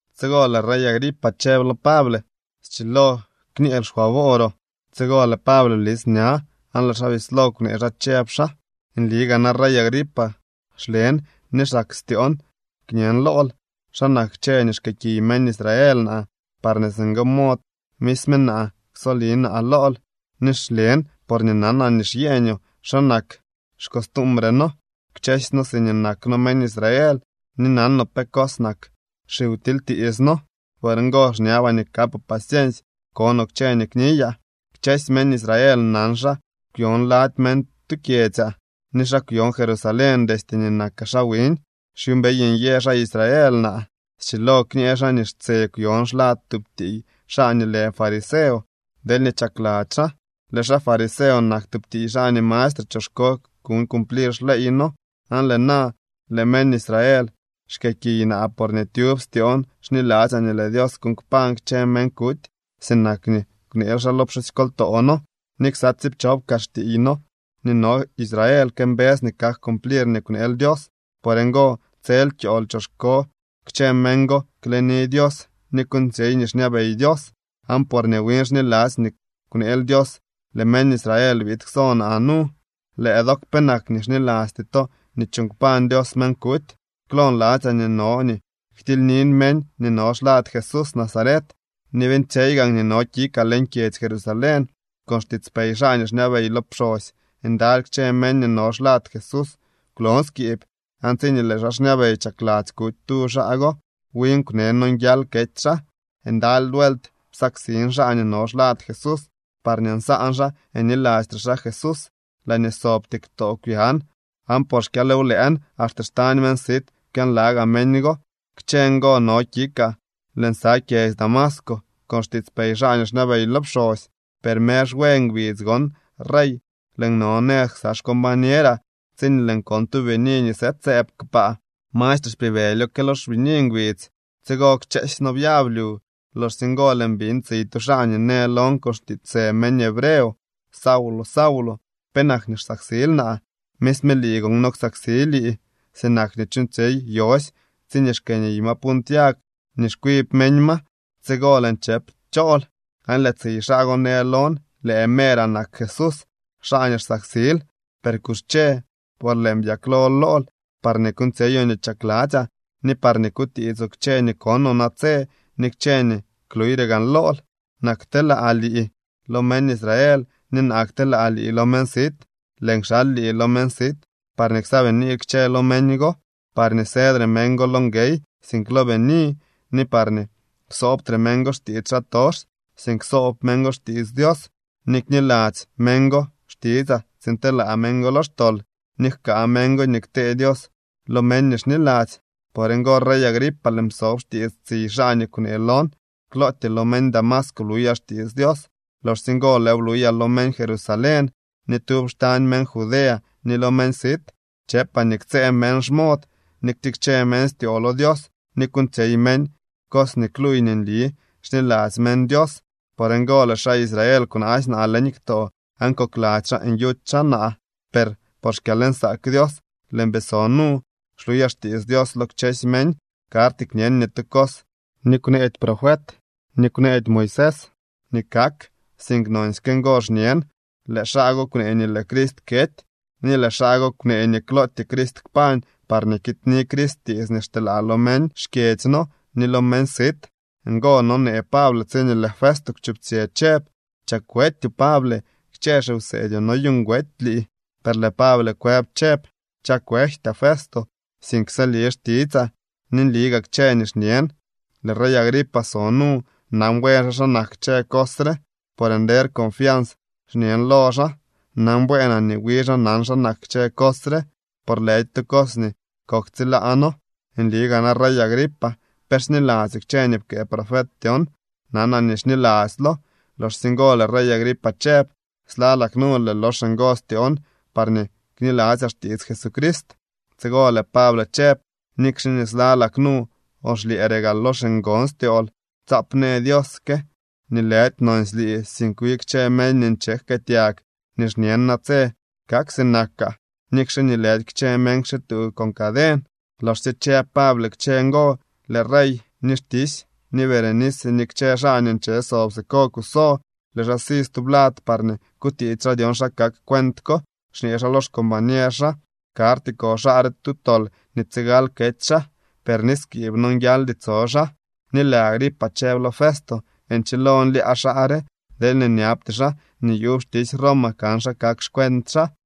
Tsigo lëë rey Agripa chëb lo Pable: —Schilo kñeel xfavooroo. Tsigo lëë Pable blis ña aan lëë xaa bislo kwnee xaa, chëb xaa: —Nli gaa na, rey Agripa, xlen ni xsak styoon kñen lool xa nak kchë nii xkëëkiy meñ Israel naa parñee singo mod misme naa ksoli naa lool. Ni xlen porñee nanaa nii xyeñoo xa nak xcostumbre noo kchësy noo siñee nak noo meñ Israel ni nanoo pe cos nak xiwtilytiits noo. Por ngo xñabaa nii kapoo paciensy konoo kchë nii kniyaa. ’Kchësy meñ Israel nan xa kwyon lady meñ tu kyedzyaa ni xa kwyon Jerusalén destye nii nakaa xaa wiñ. Xyuumbey nyë xaa Israel naa. Schilo kñë xaa nii xtse kwyon xlad tub tiiy xaa nii lë fariseo deelñee chakladzy xaa. Lëë xaa fariseo nak tub tiiy xaa nii mastre choxko kuñ cumplir xleey noo. Aan lëë na lëë meñ Israel xkëëkiy naa porñee tyub styoon xniladzyaa nii lëë Dios kuuñ kpañ kchë meñ kuty sinak nii kwneel xaa lo pxusykoltoo noo. Ni ksa tsiipchop kaa xtiiy noo nii no Israel këmbës nii kak cumplir nii kwneel Dios. Por ngo, tsel kyool choxko kchë meñ go kleni Dios ni kuuñtsyey nii xñabey Dios. Aan porñee win xniladzy nii kwneel Dios, lëë meñ Israel biid kso naa nu. ¿Lëë dook, penak nii xnilasty to nii chuuñ kpañ Dios meñ kuty? ’Klo nladzyaa nii no nii ktilynin meñ nii no xlad Jesús Nazaret ni beeñtsyey gaan nii no kikaa leñ kyedzy Jerusalén. Con xtiitspey xaa nii xñabey lo pxosy ndaly kchë meñ nii no xlad Jesús kwlon skiib. Aan tsiñee lëë xaa xñabey chakladzy kuty tu xaa go, win kwne nonguial kety xaa. Ndaly vuelt psaksin xaa nii no xlad Jesús parñee nsaan xaa nyilastre xaa Jesús. Laañee sobtyee ktoo kwyan, aan por xkyalwlëën axte xtañ meñ sit kwyanlagaa meñ go. ’Kchë ngo no kikaa lëën sa kyedzy Damasco con xtiitspey xaa nii xñabey lo pxosy. Per mer xwe ngbidz gon, rey, lëën no nëz ksa xcombañeraa tsiñee lëën kon tu bini nii sëëdsëëb kpaa. Mastre xpibëlyo que lo xbini ngbidz. Tsigo kchëësy noo byab lyu. Loxsye ngo lëën biñ tsiy tu xaa nii në lon con xtiitsë meñ hebreo: “Saulo, Saulo, ¿penak nii xsaksil naa? Misme lii gon no ksaksi lii, sinak nii chuuñtsyey yosy tsiñee xkëëniy ma punt yag nii xkwib meñ ma.” Tsigo lëën chëp: “¿Chool?” Aan lëë tsiy xaa go në lon: “Lëë meeraa nak Jesús, xaa nii xsaksil. Per kuxche, por lëën byaklo lool parñee kuuñtsyeyoo nii chakladzyaa ni parñee kutiitsoo kchë nii konoo natse ni kchë nii kluuyre gaan lool. Naa kteelaa lii lo meñ Israel ni naa kteelaa lii lo meñ sit. Lëën kxal lii lo meñ sit parñee ksaabiniil kchë lo meñ go, parñee sëdre meñ go lo nguey, sink lo bini, ni parñee ksoobtre meñ go xtiits xaatox, sink ksoob meñ go xtiits Dios, ni kniladzy meñ go xtitsaa tsiin telaa meñ go lo xtol ni jkaa meñ go nii ktee Dios lo meñ nii xniladzy.” ’Por ngo, rey Agripa, lëën psob xtiits tsiy xaa nii kwnee lon. Klootyee lo meñ Damasco bluyaa xtiits Dios. Loxsye ngo lëëw bluyaa lo meñ Jerusalén ni tyub xtañ meñ Judea ni lo meñ sit. Chëpaa nii ktsëë meñ xmod, ni ktikche meñ styoo lo Dios, ni kuuñtsyey meñ cos nii kluuy nii nli xniladzy meñ Dios. Por ngo lëë xaa Israel kwnaasy naa leñ ktoo aan kokladzy xaa nyuty xaa naa. Per por xkyalnsaak Dios lëën bii so nu, xluyaa xtiits Dios lo kchësy meñ. Karty kñen ni tu cos nii kwneedy profet ni kwneedy Moisés nii kak, sink nonsyke ngo xñen. Lëë xaa go kwnee nii lëë Crist kety, ni lëë xaa go kwnee nii klootyee Crist kpañ parñee kiidni Crist tiits nii xteelaa lo meñ xkyedzy noo ni lo meñ sit. Ngo nonee Pable tsiñee lëë Festo kwchuptsyë chëb: —¡Chak wetyoo, Pable! Kchë xiwseedyoo noyuuñ wety lii. Per lëë Pable kwëb chëb: —Chakwejtyaa, Festo, sink sëli xtitsaa ni nli gaa kchë nii xñen. Lëë rey Agripa so nu. Nan buen xaa xa nak kchë cos re. Por ngo nder confians xñen lo xaa. Nan bueenaa nii wi xaa nan xa nak kchë cos re, por lëdy tu cos nii koktsilaano. Nli gaa na, rey Agripa, ¿pe xniladzyoo kchë nii pkëë profet dyon? Nanaa nii xniladzylo. Loxsye ngo lëë rey Agripa chëb: —Slalak nu lëël lox ngo styoon parñee kniladzyaa xtiits Jesucrist. Tsigo lëë Pable chëb: —Nikxe nii slalak nu o xlyëëre gaa lox ngon styool, tsaap në Dios que nii lëdy nonsy lii, sink wi kchë meñ nii nche jkëëtyag nii xñen natse kak sinakaa, nikxe nii lëdy kchë meñ kxituu con caden. Loxsye chëb Pable kchë ngo, lëë rey ni xtisy ni Berenice ni kchë xaa nii nche sob siko kuso. Lëë xaa si tublad parñee kutiits xaa dyon xa kak cuent ko, xñee xaa lo xcombañer xaa: —Karty ko xaa re tu tol nii tsigal kety xaa, per ni skiib nonguialdy tso xaa. Ni lëë Agripa chëb lo Festo: —Nchilo nlyaa xaa re deelñee nyabty xaa nii yuub xtisy Roma kan xa kak xcuent xaa.